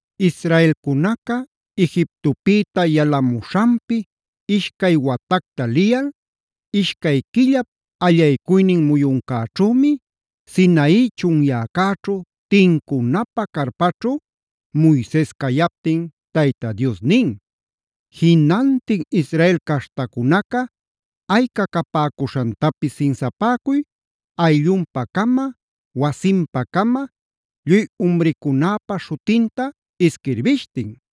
Israelcunaca Egiptopïta yalamuśhanpi ishcay watacta liyal, ishcay quillap allaycuynin muyuncäćhümi Sinai chunyäcäćhu, tincunapä carpaćhu Moises cayaptin Tayta Dios nin: “Jinantin Israel caśhtacunaca ayca capäcuśhantapis sinsapäcuy,a ayllunpa-cama, wasinpa-cama, lluy umricunäpa śhutinta isquirbishtin.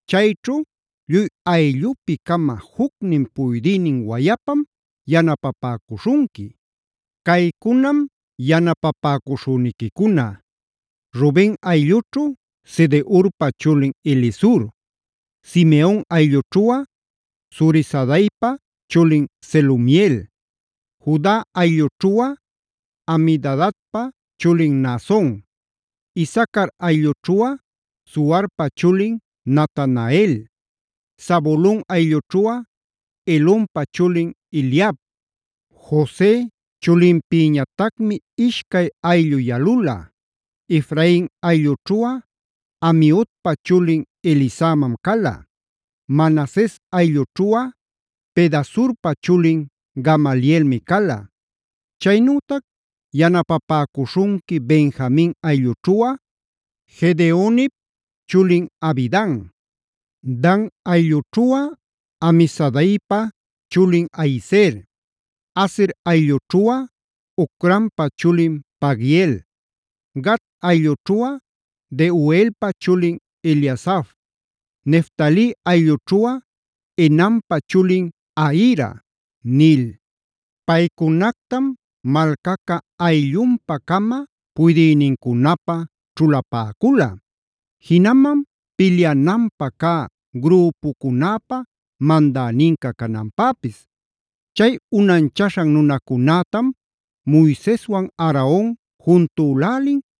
Cayćhu lluy ayllupi-cama jucnin puydïnin wayapam yanapapäcuśhunqui. Caycunam yanapapäcuśhüniquicuna: Ruben ayllućhu Sedeurpa chulin Elisur, Simeon ayllućhuꞌa Zurisadaipa chulin Selumiel, Juda ayllućhuꞌa Aminadabpa chulin Naason, Isacar ayllućhuꞌa Zuarpa chulin Natanael, Zabulon ayllućhuꞌa Helonpa chulin Eliab. Jose chulinpïñatacmi ishcay ayllu yalula: Efrain ayllućhuꞌa Amiudpa chulin Elisamam cala; Manases ayllućhuꞌa Pedasurpa chulin Gamalielmi cala. Chaynütac yanapapäcuśhunqui Benjamin ayllućhuꞌa Gedeonip chulin Abidan; Dan ayllućhuꞌa Amisadaipa chulin Ahiezer; Aser ayllućhuꞌa Ocranpa chulin Pagiel; Gad ayllućhuꞌa Deuelpa chulin Eliasaf; Neftali ayllućhuꞌa Enanpa chulin Ahira” nil. Paycunactam malcaca ayllunpa-cama puydïnincunapä ćhulapäcula; jinaman pilyananpä cä grüpucunäpä mandäninca cananpäpis. Chay unanchaśhan nunacunätam Moiseswan Aaron juntülälin,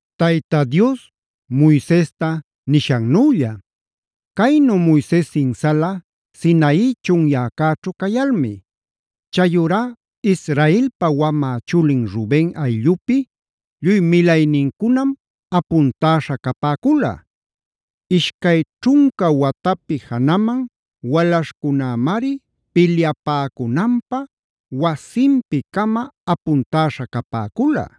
Tayta Dios Moisesta nishannülla. Caynu Moises sinsala Sinai chunyäcäćhu cayalmi. Chayurá Israelpa wamä chulin Ruben ayllupi lluy milaynincunam apuntäśha capäcula; ishcay ćhunca watapi janaman walaśhcunämari pilyapäcunanpä wasinpi-cama apuntäśha capäcula.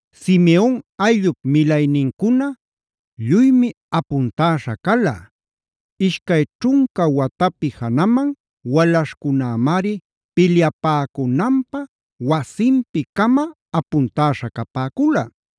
Simeon ayllup milaynincuna lluymi apuntäśha cala; ishcay ćhunca watapi janaman walaśhcunämari pilyapäcunanpä wasinpi-cama apuntäśha capäcula.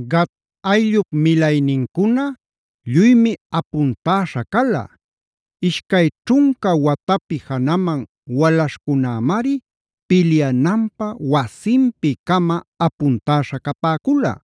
Gad ayllup milaynincuna lluymi apuntäśha cala; ishcay ćhunca watapi janaman walaśhcunämari pilyananpä wasinpi-cama apuntäśha capäcula.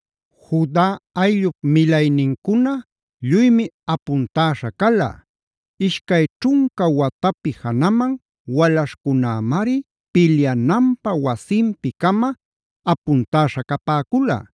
Juda ayllup milaynincuna lluymi apuntäśha cala; ishcay ćhunca watapi janaman walaśhcunämari pilyananpä wasinpi-cama apuntäśha capäcula.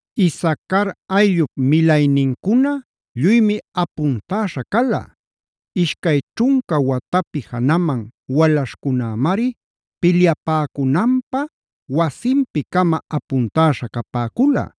Isacar ayllup milaynincuna lluymi apuntäśha cala; ishcay ćhunca watapi janaman walaśhcunämari pilyapäcunanpä wasinpi-cama apuntäśha capäcula.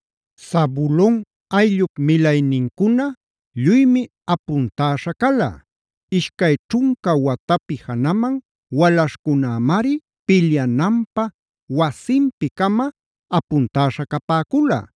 Zabulon ayllup milaynincuna lluymi apuntäśha cala; ishcay ćhunca watapi janaman walaśhcunämari pilyananpä wasinpi-cama apuntäśha capäcula.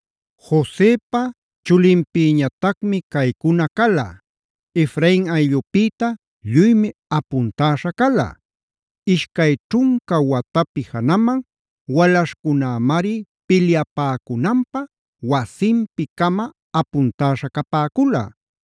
Josepa chulinpïñatacmi caycuna cala: Efrain ayllupïta lluymi apuntäśha cala; ishcay ćhunca watapi janaman walaśhcunämari pilyapäcunanpä wasinpi-cama apuntäśha capäcula.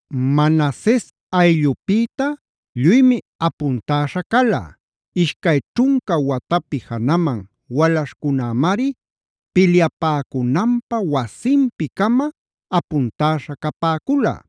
Manases ayllupïta lluymi apuntäśha cala; ishcay ćhunca watapi janaman walaśhcunämari pilyapäcunanpä wasinpi-cama apuntäśha capäcula.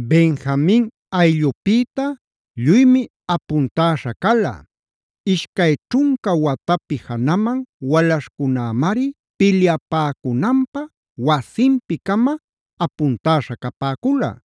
Benjamin ayllupïta lluymi apuntäśha cala; ishcay ćhunca watapi janaman walaśhcunämari pilyapäcunanpä wasinpi-cama apuntäśha capäcula.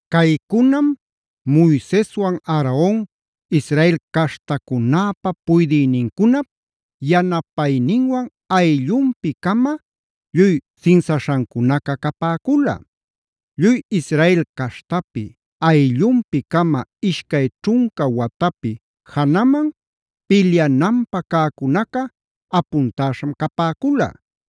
Caycunam Moiseswan Aaron, Israel cashtacunäpa puydïnincunap yanapayninwan ayllunpi-cama lluy sinsaśhancunaca capäcula. Lluy Israel caśhtapi ayllunpi-cama ishcay ćhunca watapi janaman pilyananpä cäcunaca apuntäśham capäcula.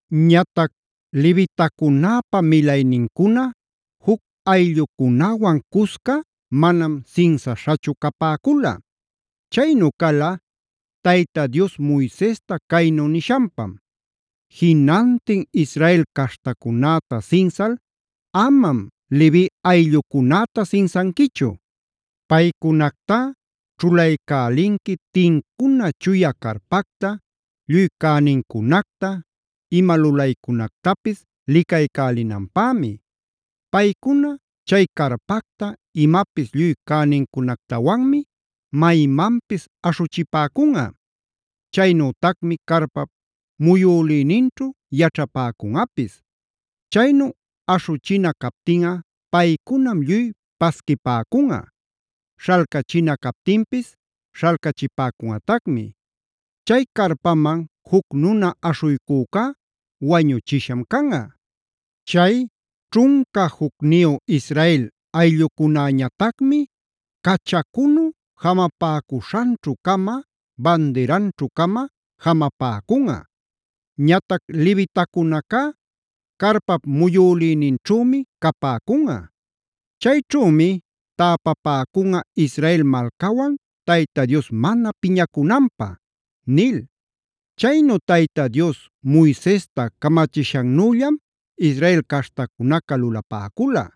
Ñatac levitacunäpa milaynincuna juc ayllucunäwan cusca manam sinsaśhachu capäcula. Chaynu cala Tayta Dios Moisesta caynu nishanpam: “Jinantin Israel caśhtacunäta sinsal amam Levi ayllucunäta sinsanquichu. Paycunactá ćhulaycälinqui tincuna chuya carpacta, lluy cänincunacta, ima lulaycunactapis licaycälinanpämi. Paycuna chay carpacta, imapis lluy cänincunactawanmi maymanpis aśhuchipäcunꞌa. Chaynütacmi carpap muyülïninćhu yaćhapäcunꞌapis. Chaynu aśhuchina captinꞌa paycunam lluy pasquipäcunꞌa; śhalcachina captinpis śhalcachipäcunꞌatacmi. Chay carpaman juc nuna aśhuycücá wañuchisham canꞌa. Chay ćhunca jucniyu Israel ayllucunäñatacmi cachacunu jamapäcuśhanćhu-cama, bandiranćhu-cama jamapäcunꞌa. Ñatac levitacunacá carpap muyulïninćhümi capäcunꞌa. Chayćhümi täpapäcunꞌa Israel malcawan Tayta Dios mana piñacunanpä” nil. Chaynu Tayta Dios Moisesta camachishannüllam Israel caśhtacunaca lulapäcula.